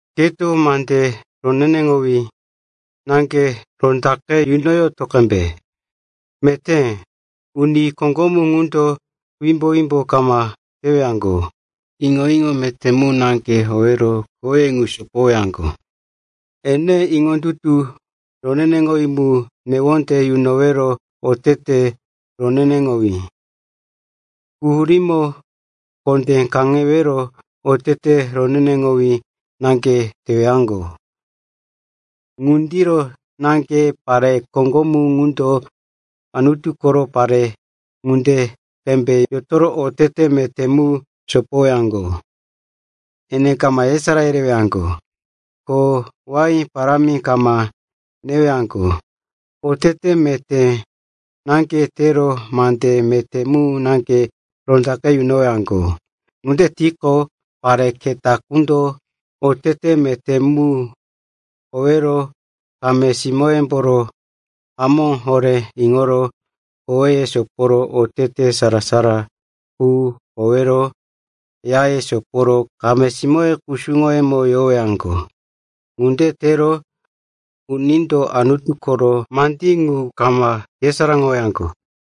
Keto mande roneneŋowí naŋge rondaqe yunoyoto qembe. Meté uni koŋgomu ŋundo wimbo-wimbo kama tewaŋgo, iŋo-iŋo meté mu naŋge howero koweye ŋu sopowaŋgo. Ene iŋondutu roneneŋowí mu, newonde yunowero otete roneneŋowí, quhurímo kondé kaŋewero otete roneneŋowí naŋge tewaŋgo. Ŋundiro naŋge pare koŋgomu ŋundo Anutu koro pare ŋunde qembe yotoro otete meté mu sopoyowaŋgo. Ene kama yesará yerewaŋgo, ko wain parámi kama newaŋgo. Otete meté naŋge tero mande meté mu naŋge rondaqe yunowaŋgo. Ŋunde tiqo, pare keta quko otete meté mu howero kame-simóyemboro hamó horé iŋoro koweye soporo otete sara-sara qu howero yaye soporo kameye kusuŋoye quroko yorowaŋgo. Ŋunde tero unindo Anutu koro mandí ŋu kama yesaráŋowaŋgo.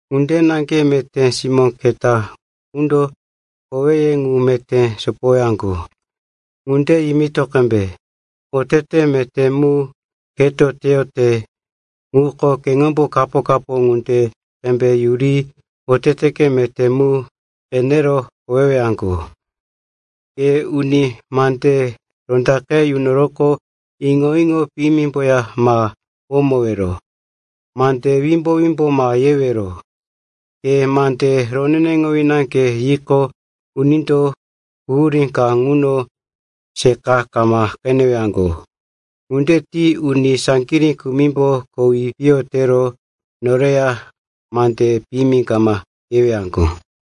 Ŋunde naŋge meté simó keta qundo koweye ŋu meté sopowaŋgo. Ŋunde yimito qembe. Otete meté mu keto teyote ŋuko keŋombo kapo-kapo ŋunde qembe yuri oteteke meté mu qenero howewaŋgo. Ke uni mande rondaqe yunoroqo, iŋo-iŋo piyimimboya ma womowero. Mande wimbo-wimbo ma yewero. Ke mande roneneŋowí naŋge yiqo, unindo quhurí ka ŋuno seqa kama qenewaŋgo. Ŋunde ti uni saŋgirí kumimbo kowi piyo tero noreya mande piyimi kama yewaŋgo.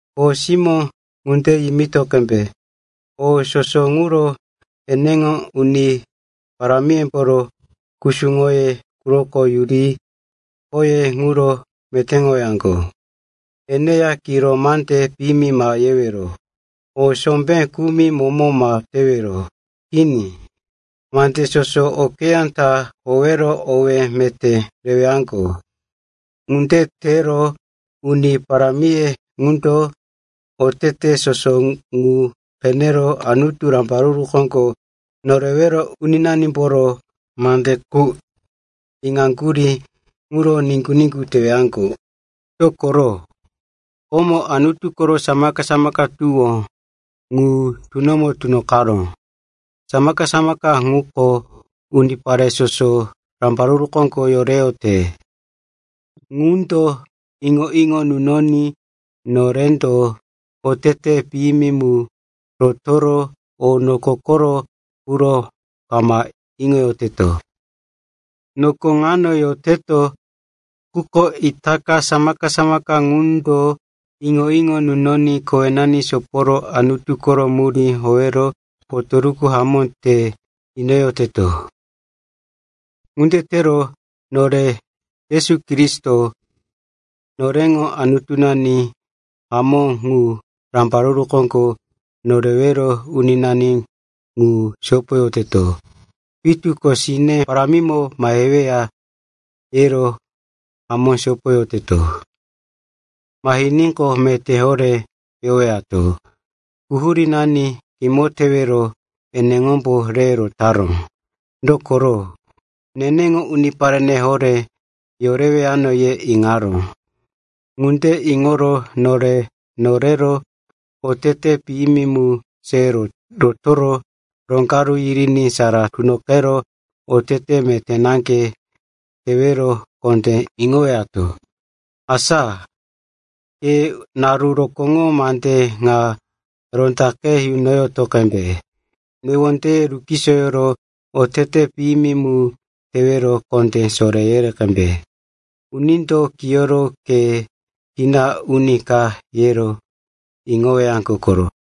Kho simó ŋande yimito qembe. O soso ŋuro eneŋo uni parámiyemboro kusuŋoye quroko yuri khoye ŋuro metéŋowaŋgo. Eneya kiro mande piyimi ma yewero. O sombé kumi momo ma tewero. Kini, mandí soso okeyá ta howero owé meté rewaŋgo. Ŋunde tero uni parámiye ŋundo oteteye soso ŋu qenero Anutu, Rambaruru Koŋgo Norewero Uninanimboro mande qu iŋaŋgurí ŋuro niŋgu-niŋgu tewaŋgo. Dokoro, komo Anutu koro samaka-samaka tuwó ŋu tunomo tunoqaró. Samaka-samaka ŋuko unipare soso rambaruru koŋgo yoreyote. Ŋundo iŋo-iŋo nunoní norendo otete piyimi mu rotoro o noko koro quro kama iŋoyoteto. Noko ŋano yoroteto, quko itaka samaka-samaka ŋundo iŋo-iŋo nunoní kowenani soporo Anutu koro murí howero potoruku hamó te inoyoteto. Ŋunde tero nore Yesu Kristo, noreŋo Anutunani hamó ŋu, Rambaruru Koŋgo Norewero Uninani ŋu sopoyoteto. Pitu ko sine parámimo maheweya, yero hamó sopoyoteto. Mahiníqo, meté horé yowato. Quhurínani kimo tewero eneŋombo re rotaró. Dokoro, neneŋo uniparene horé yorewano, ye iŋaró. Ŋunde iŋoro nore norero otete piyimi mu se rotoro roŋgaru yiriní sara tunoqero otete meté naŋge tewero kondé iŋoyowato. Asa, ke naru rokóŋo mande ŋa rondaqe yunoyoto qembe. Newondeye rukisoyoro otete piyimi mu tewero kondé soré yere qembe. Unindo kiyoro ke kina uni ka, yero iŋowaŋgo koro.